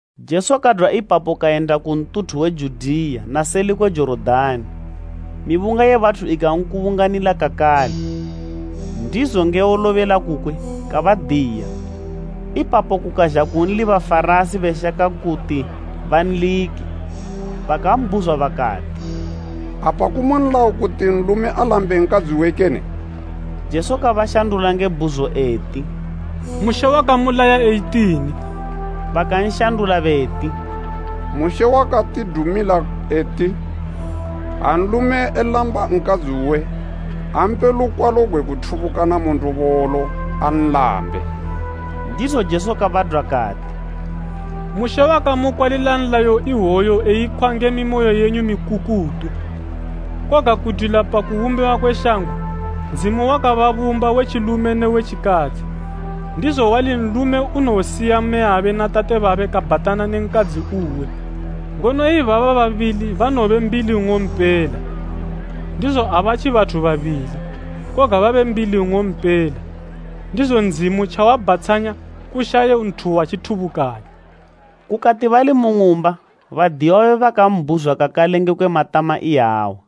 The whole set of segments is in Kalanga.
Jesu kadwa ipapo kayenda ku ntuthu we Judiya na seli kwe Jorodani. Mibunga ye bathu ikankubunganila kakale, ndizo nge wolobela kukwe, kabadiya. Ipapo kukazha kunli Bafarasi beshaka kuti banlike, bakambhuzwa bakati, “Apa kumu nlayo kuti nlume alambe nkadzi uwe kene?” Jesu kabashandula nge bhuzo eti, “Mushe wakamulaya eyitini?” Bakanshandula beti, “Mushe wakatidumila eti, ha nlume elamba nkadzi uwe, ampe lukwalo gwe kuthubukana mu ndobolo, anlambe.” Ndizo Jesu kabadwa kati, “Mushe wakamukwalila nlayo iwoyu eyikhwa nge mimoyo yenyu mikukutu. Koga kudwila pa kubumbiwa kwe shango, ‘Ndzimu wakababumba we tjilume ne we tjikadzi.’ ‘Ndizo wali nlume unowosiya mmeyabe na tate babe kabhatana ne nkadzi uwe, ngono ibaba babili banowobe mbili nng'ompela.’ Ndizo abatji bathu babili, koga babe mbili nng'ompela. Ndizo Ndzimu tjawabhatshanya, kushaye nthu watjithubukanya.” Kukati bali mu ng'umba badiyiwa babe bakambhuzwa kakale ngekwe matama iyawa.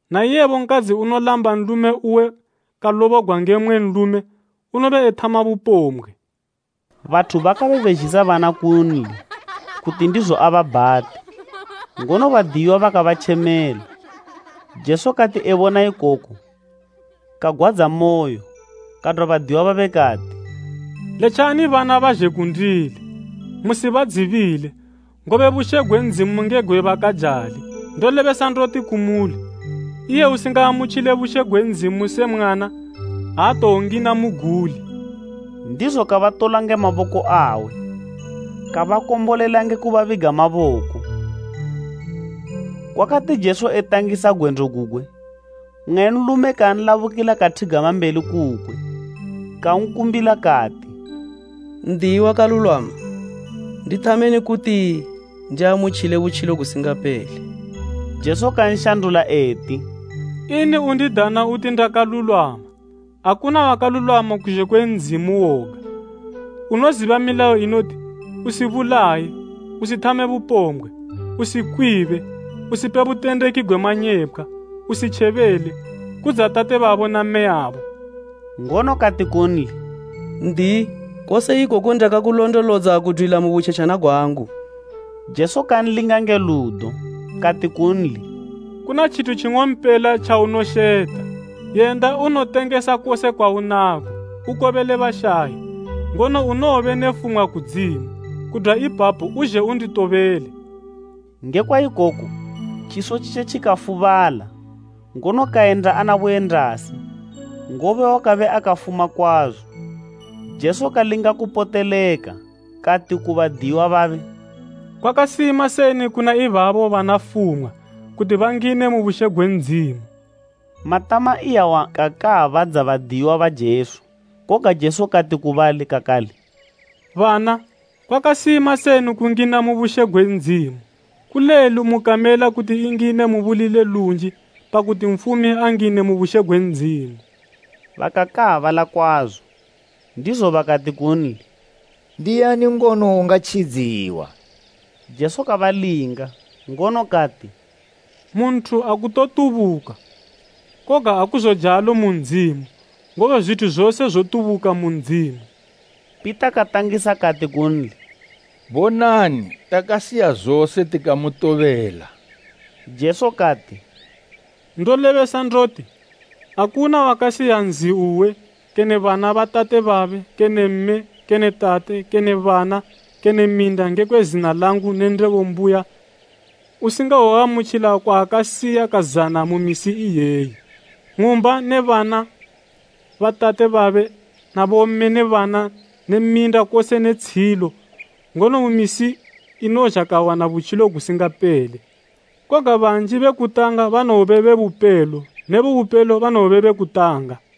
Na iyebo nkadzi unolamba nlume uwe kalobogwa nge mmwe nlume, unobe ethama bupombgwe.” Bathu bakabe bezhisa bana kunli, kuti ndizo ababhate; ngono badiyiwa bakabatjemela. Jesu kati ebona ikoku kagwadzamoyo, kadwa badiyiwa babe kati, “Letjani bana bazhe kundili, musibadzibile, ngobe bushe gwe Ndzimu nge gwe bakajali. Ndolebesa ndoti kumuli, iye usingaamutjile bushe gwe Ndzimu se mwana, aatowongina muguli.” Ndizo kabatola nge maboko awe, kabakombolela nge kubabiga maboko. Kwakati Jesu etangisa gwendo gugwe, mmwe nlume kanlabukila kathigama mbeli kukwe, kankumbila kati, “N'diyi wakalulwama, ndithameni kuti ndiamutjile butjilo gusingapele?” Jesu kanshandula eti, “Ini undidana uti ndakalulwama? Akuna wakalulwama kuzhe kwe Ndzimu woga. Unoziba milayo inoti, ‘Usibulaye, usithame bupombgwe, usikwibe, usipe butendeki gwe manyepkhwa, usitjebele, kudza tate babo na mmeyabo.’” Ngono kati kunli, “N'diyi, kose ikoku ndakakulondolodza, kudwila mu butjetjana gwangu.” Jesu kanlinga nge ludo, kati kunli, “Kuna tjithu tjing'ompela tjaunosheta. Yenda unotengesa kose kwaunako, ukobele bashayi, ngono unowobe ne fumwa kudzimu. Kudwa ipapo uzhe unditobele.” Ngekwa ikoku tjiso tjitje tjikafubala, ngono kayenda ana buyendasi, ngobe wakabe akafuma kwazo. Jesu kalinga kupoteleka, kati ku badiyiwa babe, “Kwakasima seni kuna ibabo bana fumwa, kuti bangine mu bushe gwe Ndzimu.” Matama iyawa kakaabadza badiyiwa ba Jesu. Koga Jesu kati ku bali kakale, “Bana, kwakasima seni kungina mu bushe gwe Ndzimu. Kulelu mu kamela kuti ingine mu buli le lunji, pakuti nfumi angine mu bushe gwe Ndzimu.” Bakakaabala kwazo, ndizo bakati kunli, “Ndiani ngono ungatjidziwa?” Jesu kabalinga, ngono kati, “Mu nthu akutotubuka, koga akuzojalo mu Ndzimu, ngobe zwithu zose zotubuka mu Ndzimu.” Pita katangisa kati kunli, “Bonani, takasiya zose tikamutobela.” Jesu kati, “Ndolebesa ndoti, akuna wakasiya nzi uwe, kene bana ba tate babe kene mme kene tate kene bana kene minda ngekwe zina langu ne Ndebo mbuya, usingawoamutjila kwaakasiya ka zana mu misi iyeyi, ng'umba ne bana ba tate babe na bomme ne bana ne minda kose ne tshiyilo, ngono mu misi inozha kawana butjilo gusingapele. Koga banji be kutanga banowobe be bupelo ne be bupelo banowobe be kutanga.”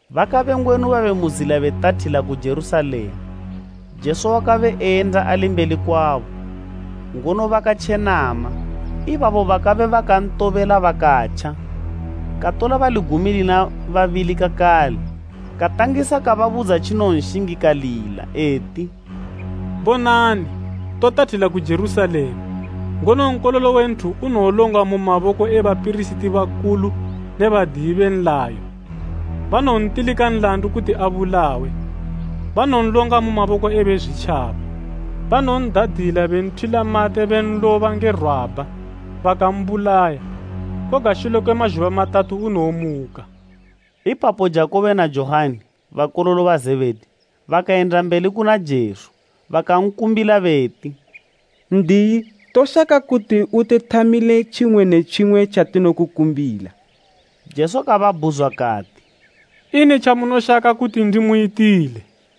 Bakabe ngwenu babe mu zila betathila ku Jerusalema. Jesu wakabe eyenda ali mbeli kwabo, ngono bakatjenama, ibabo bakabe bakantobela bakatja. Katola bali gumi lina babili kakale, katangisa kubabudza tjinowonshingikalila. Eti, “Bonani, totathila ku Jerusalema, ngono Nkololo we Nthu unowolongwa mu maboko e bapirisiti bakulu ne badiyi be nlayo, banowontilika nlandu kuti abulawe, banowonlonga mu maboko e Bezwitjaba. Banowon'dadila benthwila mate benloba nge rwabha, bakambulaya, koga shule kwe mazhuba matatu unowomuka.” Ipapo Jakubo na Johani, bakololo ba Zebhedi, bakayenda mbeli kuna Jesu bakankumbila beti, “N'diyi, toshaka kuti utithamile tjimwe ne tjimwe tjatinokukumbila.” Jesu kababhuzwa kati, “Ini tjamunoshaka kuti ndimuyitile?”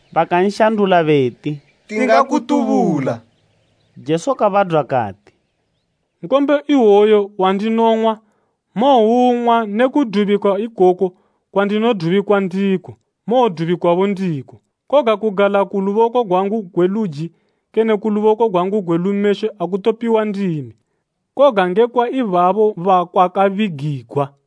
Bakanshandula beti, “Tingakutubula.” Jesu kabadwa kati, “Nkombe iwoyu wandinong'wa, mowoung'wa ne kudubikwa ikoku kwandinodubikwa ndiko, mowodubikwabo ndiko. Koga kugala ku luboko gwangu gwe luji kene ku luboko gwangu gwe lumeshwe akutopiwa ndimi, koga ngekwa ibabo bakwakabigigwa.”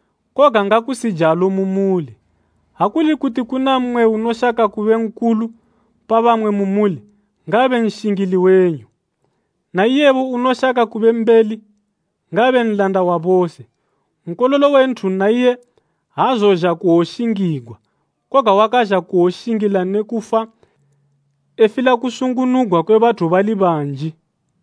Koga ngakusijalo mu muli. Ha kuli kuti kuna mmwe unoshaka kube nkulu pa bamwe mu muli, ngaabe nshingili wenyu, na iyebo unoshaka kube mbeli, ngaabe nlanda wa bose. Nkololo we Nthu naiye aazozha kuwoshingigwa, koga wakazha kuwoshingila ne kufa efila kusungunugwa kwe bathu bali banji.”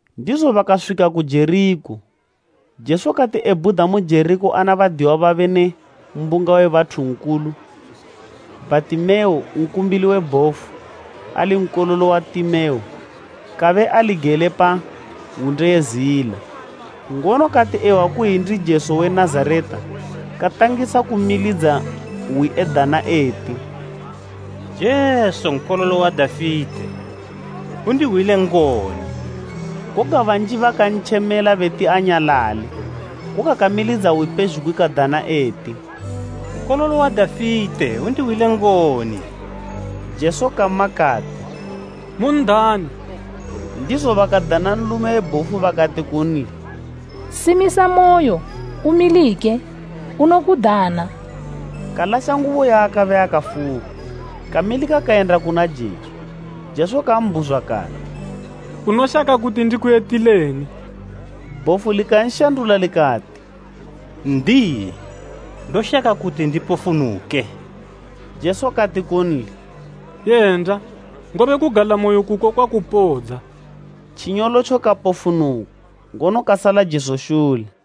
Ndizo bakaswika ku Jerikho. Jesu kati ebhuda mu Jerikho ana badiyiwa babe ne mbunga we bathu nkulu, Bhatimeo, nkumbili we bhofu, ali nkololo wa Timeo, kabe ali gele pa hwunde ye zila. Ngono kati ehwa kuyi ndi Jesu we Nazareta, katangisa kumilidza hwi edana eti, “Jesu Nkololo wa Dafite! Undihwile ngoni!” Koga banji bakantjemela beti, anyalale, koga kamilidzila hwi pezhugwi kadana eti, “Nkololo wa Dafite undihwile ngoni!” Jesu kama kati, “Mun'dane.” Ndizo bakadana nlume we bhofu bakati kunli, “Simisamoyo, umilike, unokudana.” Kalasha ngubo yaakabe akafuka, kamilika kayenda kuna Jesu. Jesu kambhuzwa kati, “Unoshaka kuti ndikuyitileni?” Bhofu likanshandula likati, “N'diyi, ndoshaka kuti ndipofunuke.” Jesu kati kunli, “Yenda, ngobe kugalamoyo kuko kwakupodza.” Tjinyolotjo kapofunuka, ngono kasala Jesu shule.